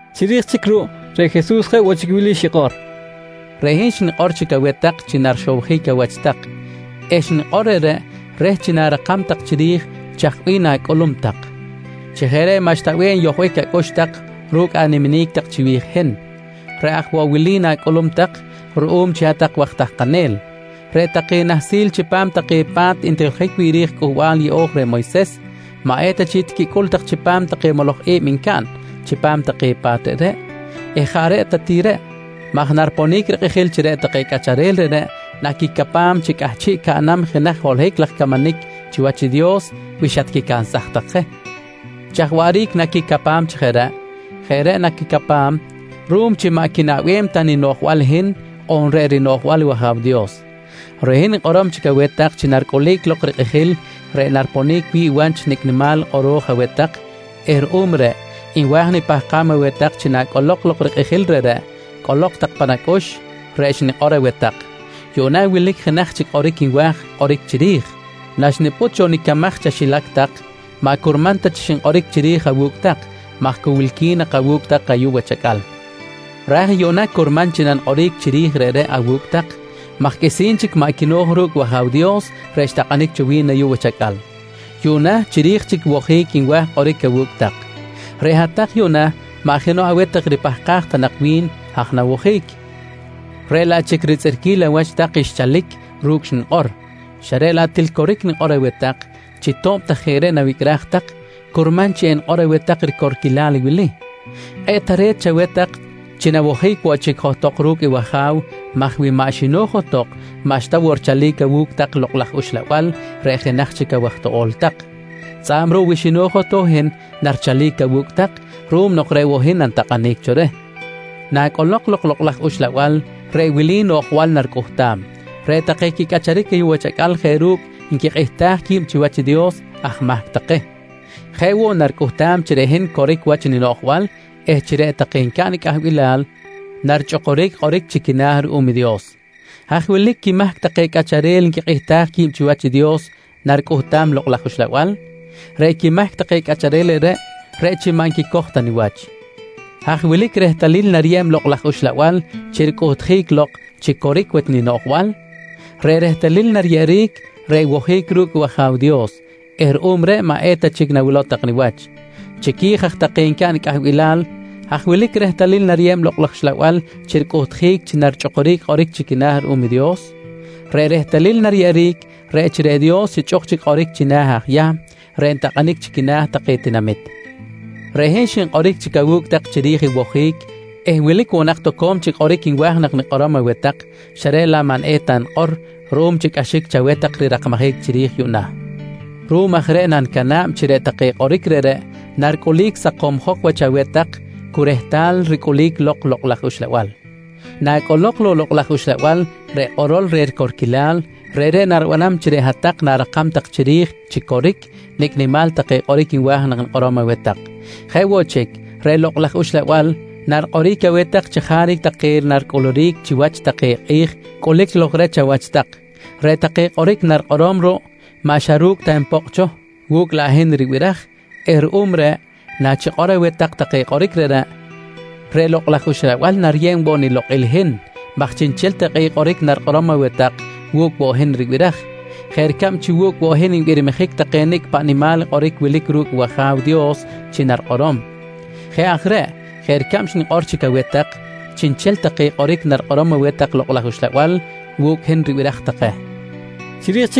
Chiri̱j chic ruꞌ reꞌ Jesus jeꞌ woꞌ chic wili xikꞌor: «Reꞌ hin xnikꞌor chic aweh tak chi narixowjic awach tak eh xnikꞌor reꞌreꞌ reh chi na̱rakam tak chiri̱j chaj bih na̱cꞌulum tak. Chi jeꞌ reꞌ maꞌxta bih enyojbic acꞌux tak ru̱cꞌ animinic tak chiwi̱j i hin. Reꞌ aj woꞌ wili na̱cꞌulum tak ruꞌum chi hat-tak waj tahkanel: Reꞌ take nahsil chipam take pa̱t ntijiljic wi̱ꞌ ri̱j i Cꞌuhbal Yeꞌo̱j reh Moyses maꞌ eta chic tiquicꞌul tak chipam take moloj i̱b ncaꞌn chipam take pa̱t reꞌreꞌ eh jaꞌ reꞌ ta ti reꞌ maj nariponic rikꞌijil chi reꞌ take cꞌacharel reꞌreꞌ naquicapam chi cꞌahchiꞌ caꞌnam jenaj holohic laj camanic chiwach i Dios wi xatquicansaj tak je. Chaj waꞌric naquicapam chi jeꞌ reꞌ? Jeꞌ reꞌ naquicapam ruꞌum chi maꞌ quinaꞌbem ta ninoꞌjbal i hin on reꞌ rinoꞌjbal wAja̱w Dios. Reꞌ hin nikꞌorom chic aweh tak chi naricꞌulic lok rikꞌijil reꞌ nariponic wi̱ꞌ wach nicꞌ nimal i kꞌoro̱j aweh tak eh ruꞌum reꞌ nwa̱j nipahkam aweh tak chi nacꞌolok lok i rikꞌijil reꞌreꞌ cꞌolok tak pan acꞌux reꞌ xnikꞌor aweh tak. «Yuꞌna wilic jenaj chic kꞌoric nwa̱j kꞌoric chiri̱j. Naxnipꞌut cho nicamaj chaxilac tak maꞌ curman ta chi xinkꞌoric chiri̱j awu̱cꞌ tak maj cu wilqui̱n nak awu̱cꞌ tak ayuꞌ wach acꞌal, ra̱j yuꞌna curman chi nanikꞌoric chiri̱j reꞌreꞌ awu̱cꞌ tak maj qꞌuisi̱n chic maꞌ quino̱j ru̱cꞌ i wAja̱w Dios reꞌ xtakꞌanic cho wi̱n awu̱cꞌ tak ayuꞌ wach acꞌal. Yuꞌna chiri̱j chic i wojic nwa̱j kꞌoric awu̱cꞌ tak. Reꞌ hat-tak yuꞌna maꞌ jenoꞌ aweh tak ripahkaj ta nak wi̱n haj nawojic, reꞌ laꞌ chic ritzꞌirquil awach tak xchalic ru̱cꞌ i xnikꞌor, xa reꞌ laꞌ til coric nikꞌor aweh tak chi to̱b ta jeꞌ reꞌ nawicꞌraj tak, curman chi enikꞌor aweh tak i ricorquilal wili: Kꞌe̱ꞌ tare̱t chaweh tak chi nawojic woꞌ chic johtok ru̱cꞌ i wAja̱w maj wi maꞌ xino̱j johtok maꞌxta woꞌ richalic awu̱cꞌ tak Lokꞌ laj Uxlabal reꞌ jenaj chic awaj toꞌo̱l tak, tzꞌa̱b ruꞌ wi xino̱j i hin narichalic awu̱cꞌ tak ruꞌum nok reꞌ woꞌ hin nanitakꞌanic cho reh. «Nacꞌolok lok i Lokꞌ laj Uxlabal, reꞌ wili noꞌjbal naricꞌuhtam: Reꞌ take quicꞌacharic ayuꞌ wach acꞌal jeꞌ ru̱cꞌ nquikꞌihtaj qui̱b chiwach i Dios aj mahc take. Jeꞌ woꞌ naricꞌuhtam chi reꞌ hin coric wach ninoꞌjbal eh chi reꞌ take ncaꞌn i cꞌahbilal narichꞌukuric kꞌoric chi quina̱ ruꞌum i Dios. Haj wilic quimahc take cꞌacharel nquikꞌihtaj qui̱b chiwach i Dios naricꞌuhtam i Lokꞌ laj Uxlabal? Reꞌ quimahc take cꞌacharel reꞌreꞌ, reꞌ chi maꞌ nquicoj ta niwach. Haj wilic i rehtalil nariyeb i Lokꞌ laj Uxlabal chi ricꞌuhtjic lok chi coric wach ninoꞌjbal? Reꞌ rehtalil nariyeꞌeric, reꞌ i wojic ru̱cꞌ i wAja̱w Dios eh ruꞌum reꞌ maꞌ eta chic nawilow tak niwach. Chiqui̱j aj take ncaꞌn i cꞌahbilal, haj wilic i rehtalil nariyeb i Lokꞌ laj Uxlabal chi ricꞌuhtjic chi narichꞌukuric kꞌoric chi quina̱ ruꞌum i Dios? Reꞌ rehtalil nariyeꞌeric reꞌ chi reꞌ Dios xichꞌuk chic kꞌoric china̱ aj Yahm reꞌ ntakꞌanic chi quina̱ take tinamit. Reꞌ hin xinkꞌoric chic awu̱cꞌ tak chiri̱j i wojic eh wilic woꞌ nak toco̱m chic kꞌoric nwa̱j nak nikꞌorom aweh tak, xa reꞌ laꞌ maꞌ eta nikꞌor ruꞌum chi cꞌaxic chaweh tak rirakmajic chiri̱j yuꞌna. Ruꞌum aj reꞌ nanicana̱b chi reꞌ take kꞌoric reꞌreꞌ naricꞌulic sakomjok wach aweh tak cu rehtal ricꞌulic lok i Lokꞌ laj Uxlabal. «Nacꞌolok lok i Lokꞌ laj Uxlabal reꞌ kꞌorol reh ricorquilal, reꞌreꞌ naribanam chi reꞌ hat-tak na̱rakam tak chiri̱j chi coric nicꞌ nimal take kꞌoric nwa̱j nak nikꞌorom aweh tak. Jeꞌ woꞌ chic, reꞌ Lokꞌ laj Uxlabal narikꞌoric aweh tak chajaric take naricꞌuluric chiwach take kꞌi̱j cꞌulic lok reh chawach tak. Reꞌ take kꞌoric narikꞌorom ruꞌ maꞌ xa ru̱cꞌ ta npokꞌ cho, wu̱cꞌ laꞌ hin ribiraj eh ruꞌum reꞌ, na chikꞌor aweh tak take kꞌoric reꞌreꞌ, reꞌ Lokꞌ laj Uxlabal nariyeb woꞌ nilokꞌil i hin maj chiꞌnchel take kꞌoric narikꞌorom aweh tak wu̱cꞌ woꞌ i hin ribiraj jeꞌ ricab chi wu̱cꞌ woꞌ i hin nbirmijic take nicꞌ paꞌ nimal kꞌoric wilic ru̱cꞌ i wAja̱w Dios chi narikꞌorom. Jeꞌ aj reꞌ jeꞌ ricab xnikꞌor chic aweh tak chiꞌnchel take kꞌoric narikꞌorom aweh tak i Lokꞌ laj Uxlabal, wu̱cꞌ i hin ribiraj take, nqui Jesus.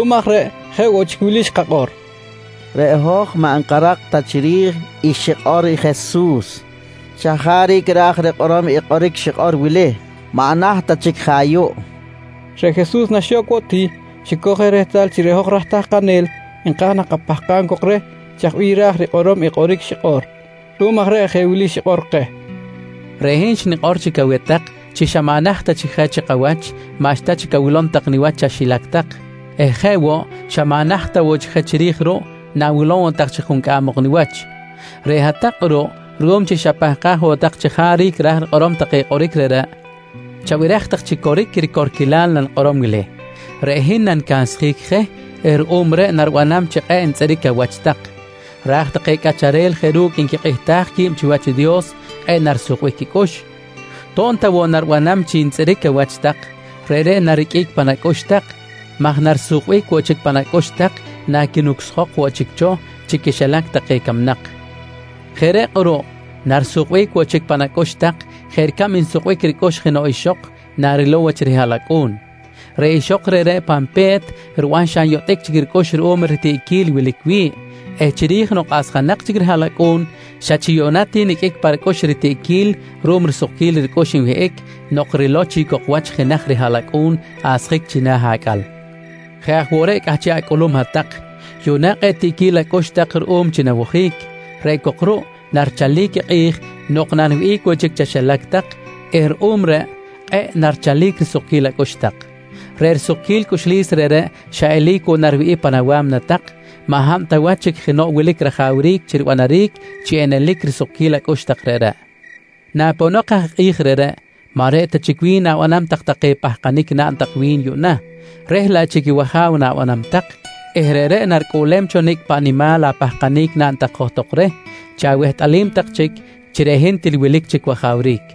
Ruꞌum aj reꞌ jeꞌ woꞌ chic wili xkakꞌor: «Reꞌ hoj maꞌ nkarak ta chiri̱j i xikꞌor i Jesus. Chajaric ra̱j rikꞌorom i kꞌoric xikꞌor wili: Maꞌ naht ta chic je ayuꞌ? kojqui. Reꞌ Jesus xa nok woꞌ ti xicoj je rehtal chi reꞌ hoj raj tahkanel nka̱j nak kapahkam cok reh chaj bih ra̱j rikꞌorom i kꞌoric xikꞌor. Ruꞌum aj reꞌ jeꞌ wili xikꞌor keh: «Reꞌ hin xnikꞌor chic aweh tak chi xa maꞌ naht ta chic je chikawach maꞌxta chic awilom tak niwach chaxilac tak eh jeꞌ woꞌ xa maꞌ naht ta woꞌ chic je chiri̱j ruꞌ na̱wilom woꞌ tak chic juncꞌam ok niwach. Reꞌ hat-tak kꞌuruꞌ ruꞌum chi xapahkaj woꞌ tak chajaric ra̱j rikꞌorom take kꞌoric reꞌreꞌ, chabiraj tak chi coric i ricorquilal nanikꞌorom wili: Reꞌ hin nanicansjic je eh ruꞌum reꞌ naribanam chi kꞌe̱ꞌ ntzꞌiric awach tak. Raj take cꞌacharel jeꞌ ru̱cꞌ nquikꞌihtaj qui̱b chiwach i Dios, kꞌe̱ꞌ narisukbic quicꞌux. To̱b ta woꞌ naribanam chi ntzꞌiric awach tak, reꞌreꞌ nariqꞌuic pan acꞌux tak maj narisukbic woꞌ chic pan acꞌux tak naquinucsjok woꞌ chic cho chi quixilac camnak. Jeꞌ reꞌ kꞌuruꞌ narisukbic woꞌ chic pan acꞌux tak jeꞌ ricab nsukbic ricꞌux jenoꞌ ixok narilow wach rihaꞌlacꞌu̱n. Reꞌ ixok reꞌreꞌ, pan pe̱t riban xa nyotꞌic chic ricꞌux ruꞌum ritiꞌquil wilic wi̱ꞌ eh chiri̱j nok asjanak chic i rihaꞌlacꞌu̱n xa chi yuꞌna ti niqꞌuic pa ricꞌux ritiꞌquil ruꞌum risukquil ricꞌux nwihꞌic nok rilow chic cok wach i jenaj rihaꞌlacꞌu̱n asjic china̱ acꞌal. Jeꞌ aj woꞌ reꞌ cꞌahchiꞌ acꞌulum hat-tak, yuꞌna kꞌe̱ꞌ tiꞌquil acꞌux tak ruꞌum chi nawojic. Reꞌ cok ruꞌ narichalic i kꞌi̱j nok naniwihꞌic woꞌ chic chaxilac tak eh ruꞌum reꞌ kꞌe̱ꞌ narichalic risukquil acꞌux tak. Reꞌ sukquil cꞌuxlis reꞌreꞌ xa eli̱c woꞌ nariwihꞌic pan awa̱mna tak maj maꞌ hab ta chic jenoꞌ wilic rajawric chi ribanaric chi enelic lok i risukquil acꞌux tak reꞌreꞌ. «Naponok aj i kꞌi̱j reꞌreꞌ, maꞌ reꞌ ta chic wi̱n na̱banam tak take pahkanic naꞌn tak wi̱n yuꞌna reh laꞌ chic i wAja̱w na̱banam tak eh reꞌreꞌ naricꞌuꞌlem cho nicꞌ paꞌ nimal apahkanic naꞌn tak johtok reh chi awehtꞌalim tak chic chi reꞌ hin til wilic chic wajawric.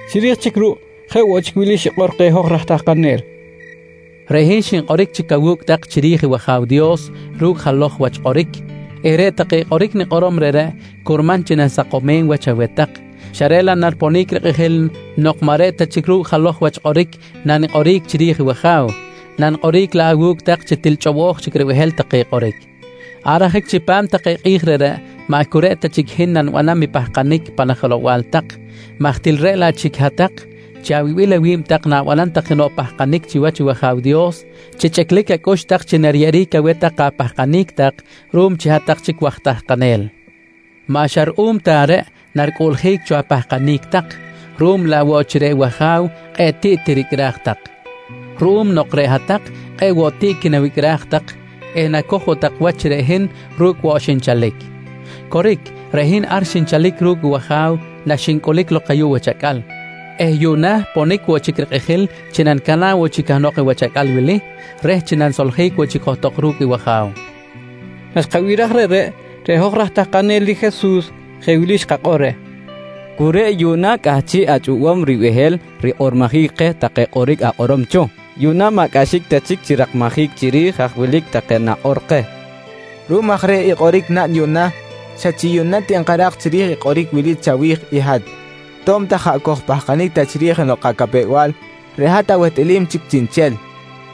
Chiri̱j chic ruꞌ jeꞌ woꞌ chic wili xikꞌor keh hoj raj tahkanel: «Reꞌ hin xinkꞌoric chic awu̱cꞌ tak chiri̱j i wAja̱w Dios ru̱cꞌ jalo̱j wach kꞌoric eh reꞌ take kꞌoric nikꞌorom reꞌreꞌ curman chi nanisakomem wach aweh tak, xa reꞌ laꞌ nariponic rikꞌijil nok maꞌ reꞌ ta chic ru̱cꞌ jalo̱j wach kꞌoric nanikꞌoric chiri̱j i wAja̱w nanikꞌoric laꞌ awu̱cꞌ tak chi til chꞌobo̱j chic ribehel take kꞌoric. Ar ajic chipam take kꞌi̱j reꞌreꞌ, maꞌ cu reꞌ ta chic i hin nanibanam i pahkanic pan ajelow-bal tak maj til reꞌ laꞌ chic hat-tak chi awibil awi̱b tak na̱banam tak jenoꞌ pahkanic chiwach i wAja̱w Dios chi chꞌiclic acꞌux tak chi nariyeꞌeric aweh tak apahkanic tak ruꞌum chi hat-tak chic waj tahkanel. «Maꞌ xa ruꞌum ta reꞌ naricꞌuꞌljic cho apahkanic tak ruꞌum laꞌ woꞌ chi reꞌ wAja̱w kꞌe̱ꞌ tiꞌ tiricꞌraj tak ruꞌum nok reꞌ hat-tak kꞌe̱ꞌ woꞌ tiꞌ quinawicꞌraj tak eh nacoj woꞌ tak wach chi reꞌ hin ru̱cꞌ woꞌ xinchalic. Coric, reꞌ hin ar xinchalic ru̱cꞌ wAja̱w naxincꞌulic lok ayuꞌ wach acꞌal eh yuꞌna ponic woꞌ chic rikꞌijil chi nanicana̱b woꞌ chic cahnok i wach acꞌal wili reh chi nanisoljic woꞌ chic johtok ru̱cꞌ wAja̱w, nqui Jesus. Naxkabiraj reꞌreꞌ, reꞌ hoj raj tahkanel i Jesus jeꞌ wili xkakꞌor reh: «Cu reꞌ yuꞌna cꞌahchiꞌ achꞌobom ribehel rikꞌormojic keh take kꞌoric akꞌorom cho. Yuꞌna maꞌ cꞌaxic ta chic chi rirakmajic chiri̱j haj wilic take nakꞌor keh. Ruꞌum aj reh i kꞌoric naꞌn yuꞌna, xa chi yuꞌna ti nkarak chiri̱j i kꞌoric wili chawi̱j i hat: To̱b ta jaꞌ kojpahkanic ta chiri̱j jenoꞌ kacapew-bal, reꞌ hat awehtꞌalim chic chiꞌnchel.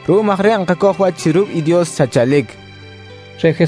Ruꞌum aj reꞌ nkacoj wach chi ru̱cꞌ i Dios xatchalic, kojqui reh.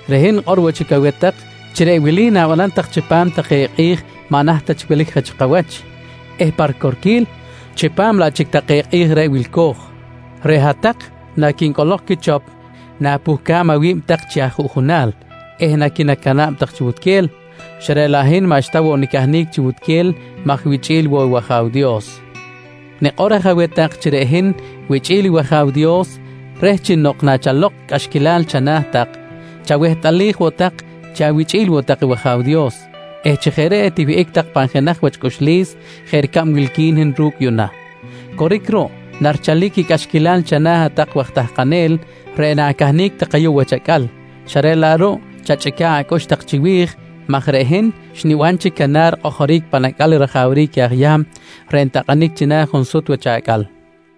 Reꞌ hin nikꞌor woꞌ chic aweh tak chi reꞌ wili na̱banam tak chipam take kꞌi̱j maꞌ naht ta chic wilic je chi kawach eh pa ricorquil chipam laꞌ chic take kꞌi̱j reꞌ wilco̱j: Reꞌ hat-tak naquincꞌolok quichop na̱puhcam awi̱b tak chi ajuꞌjunal eh naquinacana̱b tak chi wutquel, xa reꞌ laꞌ hin maꞌxta woꞌ nicahnic chi wutquel maj wichꞌi̱l woꞌ i wAja̱w Dios. «Nikꞌor aj aweh tak chi reꞌ hin wichꞌi̱l i wAja̱w Dios reh nok chi nachalok cꞌaxquilal chana̱ tak chawehtꞌalij woꞌ tak chi awichꞌi̱l woꞌ tak i wAja̱w Dios eh chi jeꞌ reꞌ etiwihꞌic tak pan jenaj wach cꞌuxlis jeꞌ ricab wilqui̱n i hin ru̱cꞌ yuꞌna. Coric ruꞌ, narichalic i cꞌaxquilal chana̱ hat-tak waj tahkanel reꞌ na̱cahnic tak ayuꞌ wach acꞌal xa reꞌ laꞌ ruꞌ chachꞌica̱ꞌ acꞌux tak chiwi̱j maj reꞌ hin xniban chic canar rikꞌojoric pan acꞌal i rajawric aj Yahm reꞌ ntakꞌanic china̱ junsut wach acꞌal, nqui Jesus.